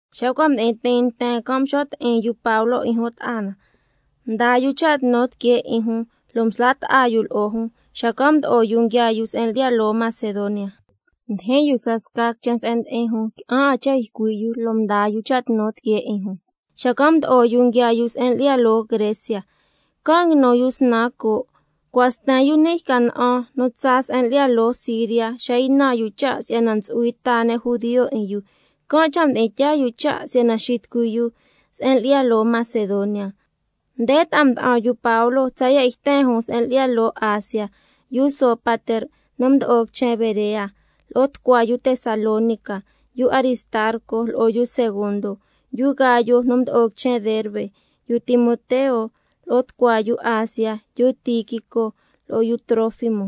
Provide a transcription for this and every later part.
Xa cua' mdi'in tiin nten can', mxo' ti'in yu Pablo 'in jun ta'a na, mdaa yu cha' tnu tiquee 'in jun, lo' msla' ta'a yu lo'o jun, xacan' mdo'o yu nguiaa yu se'en lyi'ya loo Macedonia. Mdijin yu scasca quichen se'en ndi'in jun, qui'an 'a cha' ycui' yu lo' mdaa yu cha' tnu tiquee 'in jun, xacan' mdo'o yu nguiaa yu se'en lyi'ya loo Grecia. Can' nguinu yu snan coo'. Cua' sten yu ni' yca na'an nu tsaa se'en lyi'ya loo Siria, xa ynan yu cha' si'yana ntsu'hui ta ne' judio 'in yu, can' cha' mdi'in tyaa yu cha' si'yana xitucui yu se'en lyi'ya loo Macedonia. Nde ta'a mda'an yu Pablo tsaya' yten jun se'en lyi'ya loo Asia: Yu Sópater nu mdo'o quichen Berea, lo'o tucua yu Tesalónica, yu Aristarco lo'o yu Segundo, yu Gayo nu mdo'o quichen Derbe, yu Timoteo, lo'o tucua yu Asia, yu Tíquico lo'o yu Trófimo.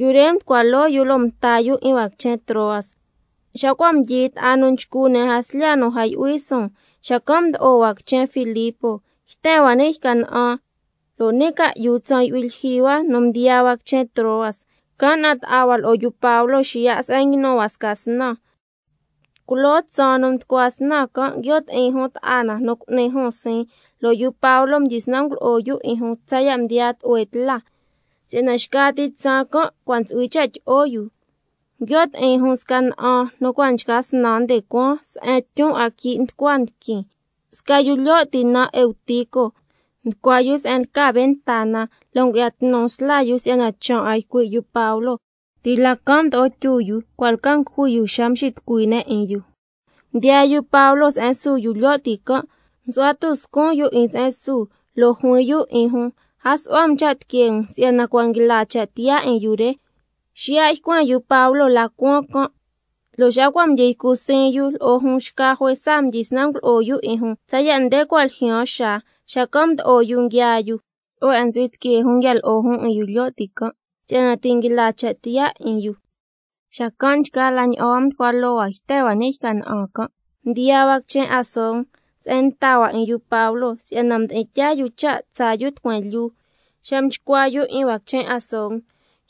Yu re mducua loo yu, lo' mta yu 'in hua quichen Troas. Xa cua' mdyi ta'a nu nchcu ne' jaslya nu a yu'hui suun, xacan' mdo'o hua quichen Filipo yten hua ni' yca na'an, lo' ni' ca'yu tsaan yu'hui lyijyi hua nu mdiyaa hua quichen Troas, can' na'an ta'a hua lo'o yu Pablo xiya' se'en nguinu hua sca snan. Culoo tsaan nu mducua snan can', nguio' ti'in jun ta'a na nu cu'ni jun siin, lo' yu Pablo mdyisnan ngulo'o yu 'in jun tsaya' mdiyaa tlu'hue tla, si'yana xca ti tsaan can' cua' ntsu'hui cha' tyi'o yu. Nguio' ti'in jun sca na'an nu cua' nchca snan nde cuaan se'en tyun 'a quii' nducua quiin. Sca yu lyo' ti naan Eutico nducua yu se'en lca ventana, lo' ngu'ya tnu sla yu si'yana chaan 'a ycui' yu Pablo. Ti' la can' mdo'o tyu yu, cua' lca ngujui yu xa mxitucui ne' 'in yu. Mdiyaa yu Pablo se'en su yu lyo' ti can', lo' msu'hua tuscun yu 'in se'en su, lo' juin yu 'in jun: A su'hua um cha' tiquee um si'yana cua' nguila cha' tiyaa 'in yu re. Xiya' ycuen yu Pablo la cuaan can', lo' xa cua' mdyi ycu siin yu lo'o jun, xca juesa mdyisnan ngulo'o yu 'in jun tsaya' nde cua' ljyaan xaa, la xacan' mdo'o yu nguiaa yu. Tsu'hue 'a ntsu'hui tiquee jun nguia lo'o jun 'in yu lyo' ti can' si'yana ti' nguila cha' tiyaa 'in yu. Xacan' nchgaa la ña'an hua mducua loo hua yten hua ni' yca na'an can', mdiyaa hua quichen Asón se'en mta hua 'in yu Pablo, si'yana mdi'in tyaa yu cha' tsaa yu tucueen lyuu. Xa mchcua yu 'in hua quichen Asón,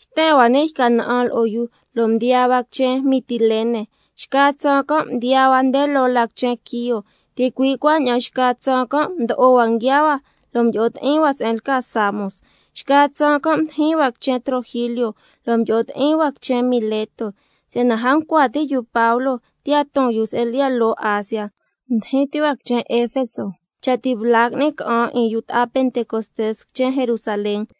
yten hua ni' yca na'an lo'o yu, lo' mdiyaa hua quichen Mitilene. Xca tsaan can' mdiyaa hua nde loo la quichen Quío, ticui' cuaña'an xca tsaan can' mdo'o hua nguiaa hua, lo' mdyi'o ti'in hua se'en lca Samos. Xca tsaan can' mdijin hua quichen Trogilio, lo' mdyi'o ti'in hua quichen Mileto. Si'yana a ncua ti' yu Pablo tiya' ton yu se'en lyi'ya loo Asia, mdijin ti hua quichen Efeso, cha' ti' bla qui'ni ca'an 'in yu ta'a Pentecostés quichen Jerusalén.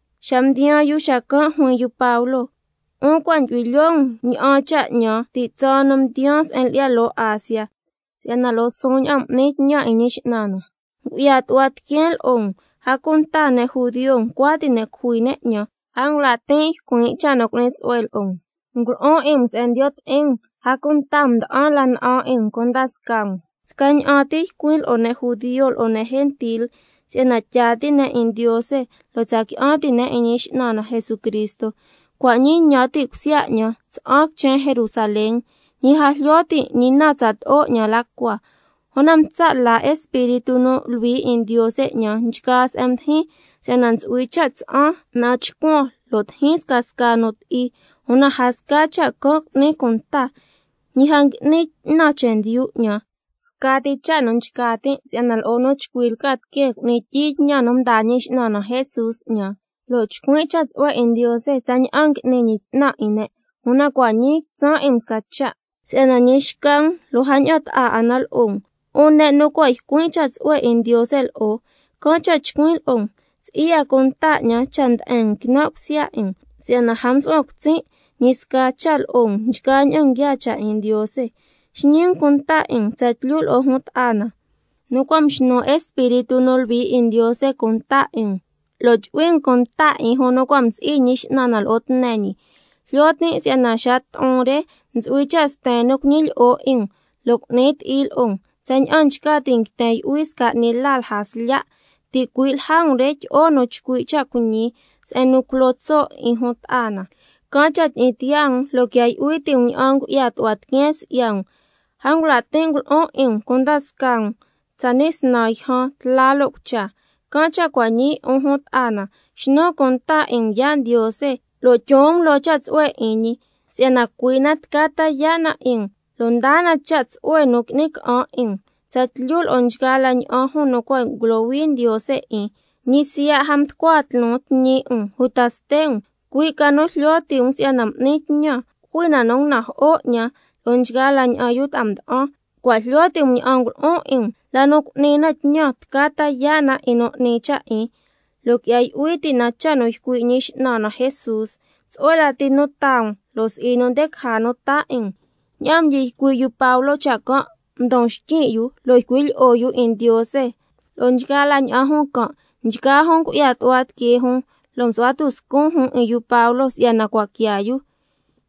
Xa mdiyaan jun xacan' juin yu Pablo: 'Un cua' ndyu'hui lyoo um ña'an cha' 'ñan ti' tsaan nu mdiyaan se'en lyi'ya loo Asia, si'yana lo'o suun ña'an m'nin tñan 'in Ñi X'nan na, ngu'ya tu'hua tiqueen lo'o um, a cunta ne' judio ncua ti' ne' cujui ne' 'ñan, a ngula' tin' ycuin' cha' nu cu'ni tsu'hue lo'o um, ngulo'on 'in um se'en ndiyo' ti'in um, a cunta mda'an la na'an 'in um cunda scaa um. Scaña'an ti ycuin' lo'o ne' judio lo'o ne' gentil, si'yana tyaa ti' ne' 'in Ndiose lo' tsa qui'an ti' ne' 'in Ñi X'nan na Jesucristo. Cua' ñii ñan ti' cusya 'ñan tsa'an quichen Jerusalén, ñi a jlyo tin' ñi na tsato'o 'ñan la cua. Una ntsa' la Espíritu nu Luhui 'in Ndiose 'ñan nchgaa se'en ndijin, si'yana ntsu'hui cha' tsa'an na'an chcuan, lo' tijin scasca nu ti'i. Una a sca cha' can' cu'nin cunta, ñi a ngui'nin 'tnan chendyu 'ñan, scati cha' nu nchca tin' si'yana lo'o nu chcui lca tiqueen cu'nin tyiin tñan nu mdaa Ñi X'nan na Jesús 'ñan, lo' chcuin' cha' tsu'hue 'in Ndiose tsaña'an ngui'ni ñi 'tnan 'in ne'. Una cua' ñii quitsan' 'in um sca cha', si'yana ñi xca um lo' a ña'an ta'a 'a na lo'o um, 'un ne' nu cua' ycuin' cha' tsu'hue 'in Ndiose lo'o. Can' cha' chcuin' lo'o um, si'i 'a cunta 'ñan cha' nde'en um quinan' cusya 'in um, si'yana a msu'huan cutsin' ñi sca cha' lo'o um nchgaa ña'an nguiaa cha' 'in Ndiose. Xñi um cunta 'in um tsatlyu lo'o jun ta'a na nu cua' mxnu Espíritu nu Luhui 'in Ndiose cunta 'in um, lo' cuaña'an chu'hui um cunta 'in jun nu cua' msi'i Ñi X'nan na lo'o tne ñi. Jlyo tin' si'yana xa to'on re ntsu'hui cha' sten nu cuñilyi'o 'in um lo' cu'ni ti'i lo'o um, tsaña'an nchca ti' nguiten yu'hui sca 'ni la lja slya'. Ticui' lja um re tyi'o nu chcui' cha' cuiñi se'en nu culo tso' 'in jun ta'a na. Can' cha' tyi'in tiyaa um, lo' quia yu'hui ti' um ña'an ngu'ya tu'hua tiqueen si'ya um, a ngula' tin' ngulo'on 'in um cunda scaa um tsani' snan yjan, tla lo' cucha. Can' cha' cua' ñii, 'un jun ta'a na, xnun cunta 'in um yaa' Ndiose lo' tyon um loo cha' tsu'hue 'in ñi, si'yana cui' na tca ta yaa' na 'in um, lo' taa na cha' tsu'hue nu qui'ni ca'an 'in um, tsatlyu lo'o nchgaa la ña'an nu cua' ngulohui Ndiose 'in. Ñi siya', a mducua tloon tñi 'in um uta ste' um. Cui' ca nu jlyo ti' um, si'yana m'nin tñan, jui na nu ngunajo'o 'ñan lo'o nchgaa la ña'an yu ta'a mda'an. Cua' jlyo ti' um ña'an ngulo'on 'in um, la nu cu'ni na tñan tca ta yaa' na 'in nu 'ni cha' 'in, lo' quia yu'hui ti' na cha' nu ycui' Ñi X'nan na Jesús: Tsu'hue lati nu taa um, lo' si'i nu nde caja nu taa 'in um. Ña'aan mdyi ycui' yu Pablo cha' can', mdon xtyin' yu lo' ycui' lyi'o yu 'in Ndiose lo'o nchgaa la ña'an jun can'. Nchgaa jun ngu'ya tu'hua tiquee jun, lo' msu'hua tuscun jun 'in yu Pablo si'yana cua' quiaa yu.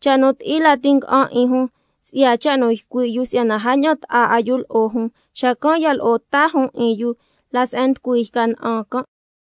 Cha' nu ti'i lati nga'an 'in jun, si'ya cha' nu ycui' yu si'yana a ña'an ta'a 'a yu lo'o jun. Xacan' ya lo'o ta jun 'in yu la se'en nducui yca na'an can'.